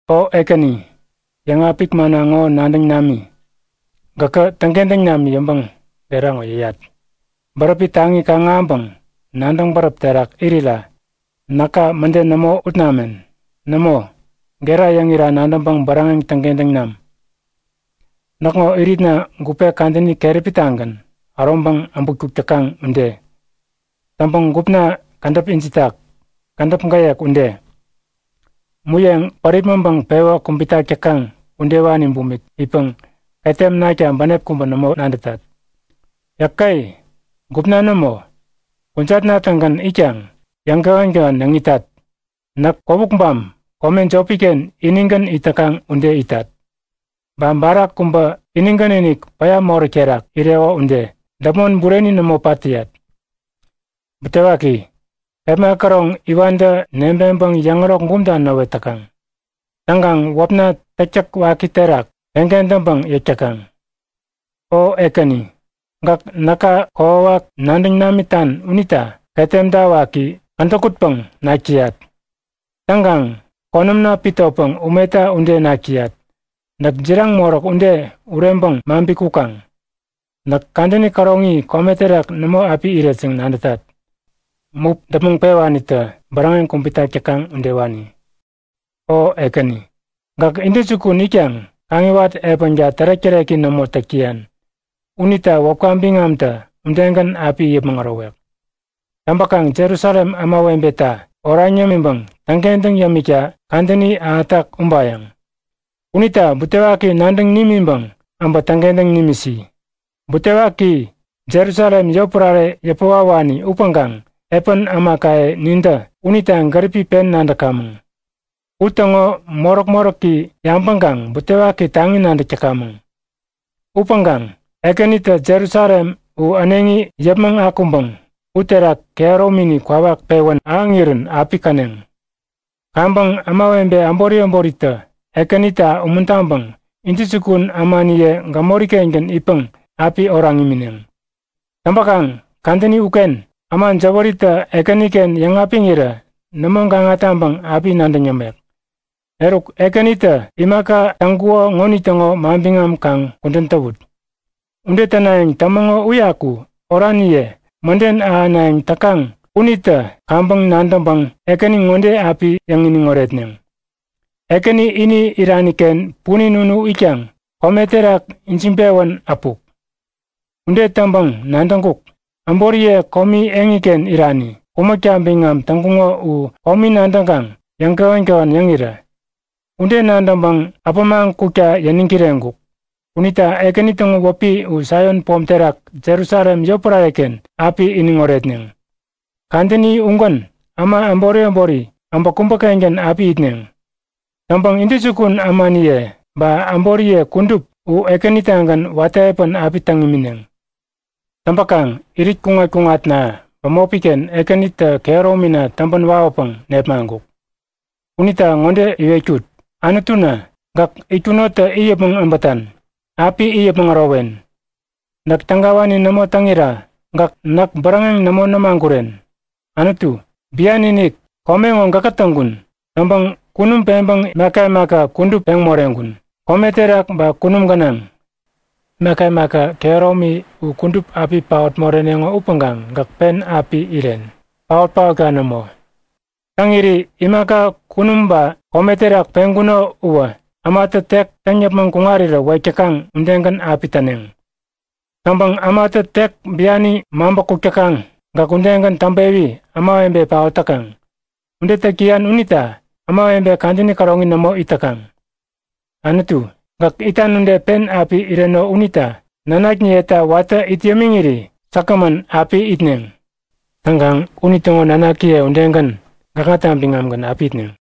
O Ekäni, yäŋapik manna ŋo nadäŋ nami. Gäkä täŋkentäŋ nami yäŋpäŋ gera ŋo yäyat. Bäräpi taŋi kaŋ-ahäŋpäŋ nadäŋ bäräp terak irira näka mäde nämo ut namen. Nämo, gera yäŋira nadäŋpäŋ bäräŋeŋ täŋkentäŋ nam. Näkŋo iritna gupe kadäni keräpitagän äroŋpäŋ abutkuk täkaŋ ude. Täŋpäŋ gupna kädäp ijitak, kädäp gäyek ude. Muyeŋ päripmäŋpäŋ pewä kubitak täkaŋ udewani bumik itpäŋ ketem nakta bänep kubä nämo nadätat. Yäke! Gupna nämo, kujatna-tägän itkaŋ yäŋkähän-kähän yäŋ itat. Näk kwäwukbam kome jopiken inigän it täkaŋ ude itat. Ba barak kubä inigän-inik päya moräk terak ireko ude. Däpmon bureni nämo pat täyat. Butewaki, kepma käroŋ iwantä nebeŋpäŋ yäŋärok bumta näwet täkaŋ. Täŋkaŋ wäpna täktäk waki terak peŋkentäŋpäŋ yäk täkaŋ. O Ekäni, gäk näka kokwawak nadäŋ namitan unita ketemta waki, kädäkutpäŋ nak täyat. Täŋkaŋ konämna pitopäŋ umeta ude nak täyat. Näk jiraŋ moräk ude ureŋpäŋ maŋpi kukaŋ. Näk kadäni käroŋi kome terak nämo api iret yäŋ nadätat. Mup däpmäŋ pewanitä bäräŋeŋ kubitak täkaŋ udewani. O Ekäni, gäk intäjukun itkaŋ kaŋiwat epänka tärek-täreki nämo täk täyan. Unita wäpka biŋamtä udegän api it yäpmäŋ ärowek. Täŋpäkaŋ Jerusalem ämawebeta oraŋ yämiŋpäŋ täŋkentäŋ yämikta kadäni ahätak ubayäŋ. Unita butewaki nadäŋ nimiŋpäŋ äbä täŋkentäŋ nimisi. Butewaki, Jerusalem yotpärare yäpäwawani upäŋkaŋ epän ämakaye nintä unita gäripi pen nadäkamäŋ. U täŋo moräk-moräki yabäŋkaŋ butewaki taŋi nadäk täkamäŋ. Upäŋkaŋ Ekänitä Jerusalem u äneŋi yäpmäŋ akuŋpäŋ uterak kehäromini kwawak pewän ahäŋirän api käneŋ. Kaŋpäŋ ämawebe äbori äboritä Ekänita umuntaŋpäŋ intäjukun ämaniye gämori-kengän itpäŋ api oraŋ imineŋ. Täŋpäkaŋ kadäni uken äma jäwäritä Ekäniken yäŋapiŋirä nämo gaŋa taŋpäŋ api nadäŋ yämek. Eruk Ekänitä imaka täŋkuko ŋonitäŋo manbiŋam kaŋ kudän täwut. Ude tänayäŋ tämäŋo uyaku oraniye mäden ahänayäŋ täkaŋ unitä kaŋpäŋ nadäŋpäŋ Ekäni ŋode api yäŋ-iniŋ oretneŋ; Ekäni ini iraniken punin unu itkaŋ kome terak ijiŋpewän äpuk. Ude täŋpäŋ nadäŋkuk; Äboriye komi eŋiken irani, kumäkta biŋam täŋkuŋo u komi nadäŋkaŋ yäŋkähän-kähän yäŋirä. Ude nadäŋpäŋ äpämaŋ kukta yäniŋ kireŋkuk. Unita Ekäni täŋo wäpi u Saion pom terak Jerusalem yotpärareken api iniŋ oretneŋ. Kadäni ugän äma äbori äbori äbä kubäkengän api itneŋ. Täŋpäŋ intäjukun ämaniye ba äboriye kudup u Ekänitagän watä epän api täŋ imineŋ. Täŋpäkaŋ irit kuŋat-kuŋatna bämopiken Ekänitä kehäromina täŋpän wawäpäŋ nepmaŋkuk. Unita ŋode iwetkut; Anutuna, gäk itkunotä it yäpmäŋ äbätan. Api it yäpmäŋ ärowen. Näk tägawani nämo täŋira gäk näk bäräŋeŋ nämo nämaguren! Anutu, bian-inik kome ŋo gäkä täŋkun. Täŋpäŋ kunum peŋpäŋ imaka imaka kudup peŋ moreŋkun, kome terak ba kunum gänaŋ. Imaka imaka kehäromi u kudup api paot moreneŋo upäŋkaŋ gäk pen api iren, paot-paotka nämo. Täŋiri imaka kunum ba kome terak peŋkuno uwä ämatä tek täŋ yäpmäŋ kuŋarirä wek täkaŋ udegän api täneŋ. Täŋpäŋ ämatä tek biani maŋpäkuk täkaŋ gäk udegän täŋpewi ämawebe paot täkaŋ. Ude täk täyan unita ämawebe kadäni käroŋi nämo it täkaŋ. Anutu, gäk itan ude pen api ireno unita nanakniyeta watä it yämiŋiri säkgämän api itneŋ. Täŋkaŋ unitäŋo nanakiye udegän, gäkŋata biŋamgän api itneŋ.